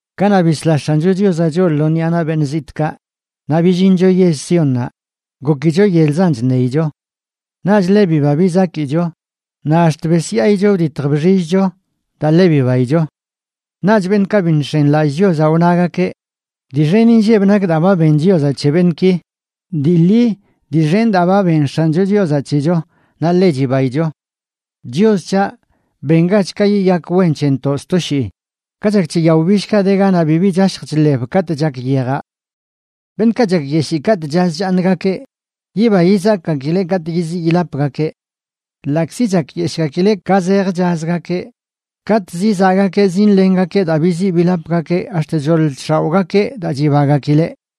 Kanaꞌ bisla X̱ancho Chiozaꞌ choꞌ lo ṉꞌia naꞌ beṉꞌ zitꞌkaꞌ naꞌ billincho yell Siónnaꞌ, gokicho yelzan chṉeicho. Naꞌch ḻe biba bizakicho naꞌ ax̱t besyaayicho, wditj bxillcho daa ḻe bibaicho. Naꞌch beṉꞌkaꞌ bi nx̱enilallꞌ Chiozaꞌ wnagakeꞌ: “Dii xen inlleb nak daa ba ben Chios c̱he beṉꞌki.” Dii ḻi, dii xen daa ba ben X̱ancho Chiozaꞌ c̱hecho, naꞌ ḻe chibaicho. Chios c̱haꞌ, bengach ka yiyak wen c̱hentoꞌ sto shii, ka chak c̱he yao billkaꞌ de ganaꞌ bibi chashj chḻeb katꞌ chak yejaꞌ. Beṉꞌkaꞌ chakyeshii katꞌ chaz chaaṉgakeꞌ, yiba yizakꞌgakileꞌ katꞌ yiziꞌ yilapgakeꞌ. Ḻaꞌkzi chakyeshꞌgakileꞌ ka zej chazgakeꞌ, katꞌ zizaꞌgakeꞌ zinlengakeꞌ daa biziꞌ bilapgakeꞌ ax̱t choḻ chx̱aoꞌgakeꞌ daa chibagakileꞌ.